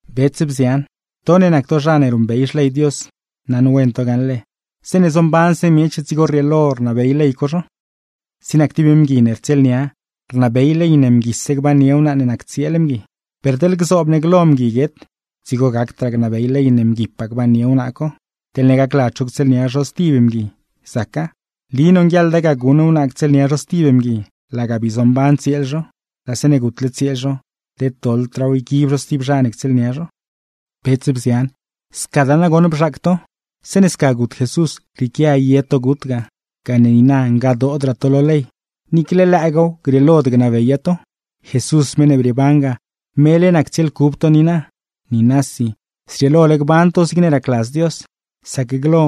Bets, bzian, to ne nac to zha ne ruṉbey Xley Dios, naṉwen to gaṉle, zeeṉe zombanse miech dzigo rrieelo rnabey ley co zho. Zig nac tib mgui ne rtsieelnia, rnabey ley ne mguise gbannie wnaa ne nac tsieel mgui. Per teḻ gzoob ne glo mgui guet, dzigo gacdraa gnabey ley ne mguipaa gbannie wnaa co; teḻne gacladz zho ctsieelnia zho stib mgui, zaca. Nli nonguieḻda ga guṉ wnaa ctsieelnia zho stib mgui laga bii zomban tsieel zho; laa zeeṉe gutle tsieel zho, led doḻdraaw yguib zho stib zha ne ctsieelnia zho. Bets, bzian, scadaa nagoṉ bzhaac to. Zeeṉe sca gut Jesús, rrieequia ye to gut ga gane niina ngadoodraa to lo ley, niicle lëëgaaw grieelod gnabeya to. Jesús, meṉ ne brieeban ga, mele nac tsieel cub to niina. Niinasi, zrieelole gban to zigne racladz Dios; sac glo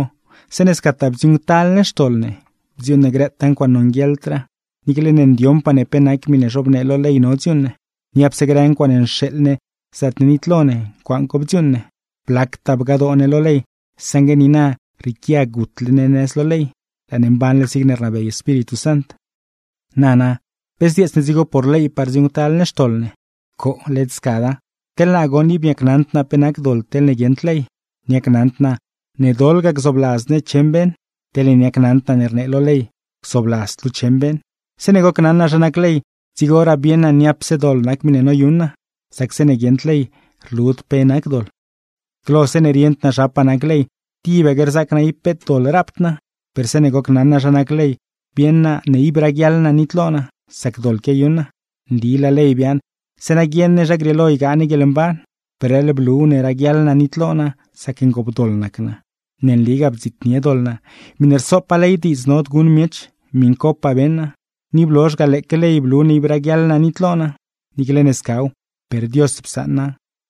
(zeeṉe scataa bdziuuṉctal ne xtoḻ ne, bdziuuṉ ne grëtaa ncuaaṉe nonguieḻdraa niicle ne ndioṉpaa ne pe nac miṉe zhobnee lo ley no dziuuṉ ne), niapse grë ncuaaṉe nxeeḻ ne zaatne nitlo ne, ncuaaṉ co bdziuuṉ ne. Blactaa bgadoo ne lo ley, saṉgue niina rrieequia gutle ne nëz lo ley, laa ne mbanle zigne rnabey Espíritu Sant. Nana, ¿pe zdzieets ne dzigo por leypaa rdziuuṉctal ne xtoḻ ne? ¡Coo, led scada! Teḻ naa goṉ, ib niacnaṉd naa pe nac doḻ teḻne guieṉd ley. Niacnaṉd naa ne doḻ ga gzoobladz ne cheṉ beṉ, teḻne niacnaṉd naa ne rnee lo ley: “Gzoobladzd luu cheṉ beṉ.” Zeeṉe gocnaṉ naa zha nac ley, dzigoraa bieṉ naa niapse doḻ nac miṉe noyuṉ naa; sac zeeṉe guieṉd ley, rlud pe nac doḻ. Glo zeeṉe rieṉd naa zhapaa nac ley, tibaque rzaac naa ib peet doḻ rapd naa; per zeeṉe gocnaṉ naa zha nac ley, bieṉ naa ne ib raguiaḻ naa nitlo naa, sac doḻ quiayuṉ naa. Nli laa ley biaaṉ zeeṉa guieṉ ne zha grieelo ygaa ne guieḻmban, per leḻ bluw ne raguiaḻ naa nitlo naa sac ngoopdoḻ nac naa. Ne nligaa bdziitnie doḻ naa, miṉe rsopaa ley diidz nod guṉ miech miṉcopaa beṉ naa; ni blozh ga, lëëque ley blu ne ib raguiaḻ naa nitlo naa. Niicle ne scaw, per Dios psaṉa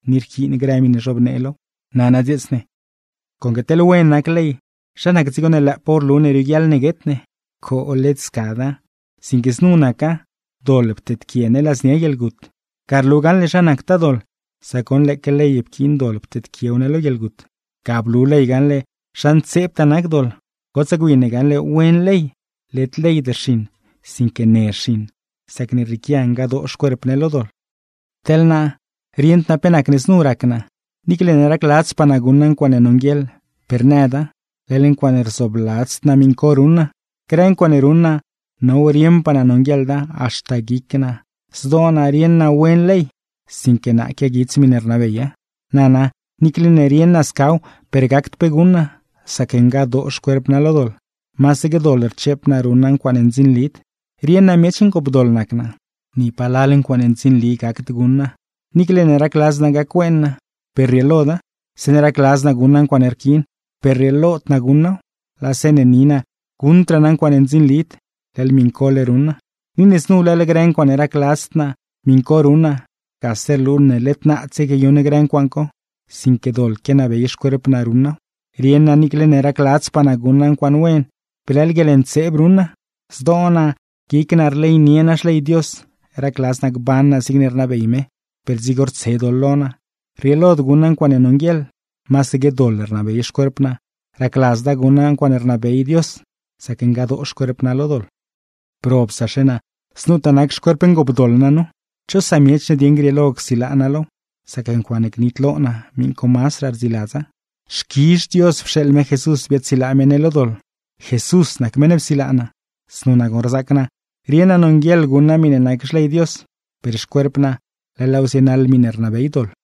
ni rquiin grë miṉe zhobnee low. Nana dzieets ne: conque teḻne wen nac ley, ¿zha nac dzigo ne lëëpaaw rlu ne rioguiaḻ ne guet ne? ¡Coo, led scada! Sinque znu naca: doḻ pteedquie ne ladznia guieḻgut. Ga rlu gaṉle zha nactaa doḻ, sac goṉ lëëque ley pquiin doḻ pteedquiew ne lo guieḻgut. Ga blu ley gaṉle zha ntseebtaa nac doḻ. Gotsaa gwi ne gaṉle wen ley, led leyd rxiṉ sinque ne rxiṉ; sacne rrieequia ngadoo xcuerp ne lo doḻ. Teḻ naa, rieṉd naa pe nacne znu rac naa, niicle ne racladzpaa naa guṉ naa ncuaaṉe nonguieḻ per nëda, leḻ ncuaaṉe rzoobladzd naa miṉ co ruṉ naa. Grë ncuaaṉe ruṉ naa, now rieṉpaa naa nonguieḻda; haxta guic naa, zdoo naa, rieṉ naa wen ley sinque naa quiaguits miṉe rnabeya. Nana, niicle ne rieṉ naa scaw per gacd pe guṉ naa, sac ngadoo xcuerp naa lo doḻ, masaque doḻ rcheep naa ruṉ naa ncuaaṉe ndzinlid. Rieṉ naa miech ngoopdoḻ nac naa, ni palal ncuaaṉe ndzinli gacd guṉ naa; niicle ne racladz naa gac-wen naa, per rrieeloda. Zeeṉe racladz naa guṉ naa ncuaaṉe rquiin, per rrieelod guṉ naaw; laa zeeṉe ni naa guṉdraa naa ncuaaṉe ndzinlid, leḻ miṉcole ruṉ naa. Ni ne znu leḻ grë ncuaaṉe racladzd naa, miṉ co ruṉ naa, gase rlu ne led naadse quiayuṉ grë ncuaaṉ co; sinque doḻ quianabey xcuerp naa ruṉ naaw. Rieṉ naa niicle ne racladzpaa naa guṉ naa ncuaaṉe wen, per leḻ guieḻntseeb ruṉ naa. Zdoo naa, guic naa, rleynie naa Xley Dios, racladz naa gban naa zigne rnabey me; per dzigo rtse doḻ lo naa, rrieelod guṉ naa ncuaaṉe nonguieḻ. Masaque doḻ rnabey xcuerp naa, racladzda guṉ naa ncuaaṉe rnabey Dios; sac ngadoo xcuerp naa lo doḻ. ¡Probsaxe naa, znutaa nac xcuerp ngoopdoḻ naa nu! ¿Cho samiech ne dieṉ grieelo csilaa naa low; sac ncuaaṉe gnitlo naa miṉ co mazdraa rdziladza? ¡Xquizh Dios pxeeḻ me Jesús biaadsilaa me ne lo doḻ! ¡Jesús nac meṉ ne psilaa naa! (Znu nagoṉ rzac naa: rieṉ naa nonguieḻ guṉ naa miṉe nac Xley Dios, per xcuerp naa leḻ laaw zienaḻ miṉe rnabey doḻ.)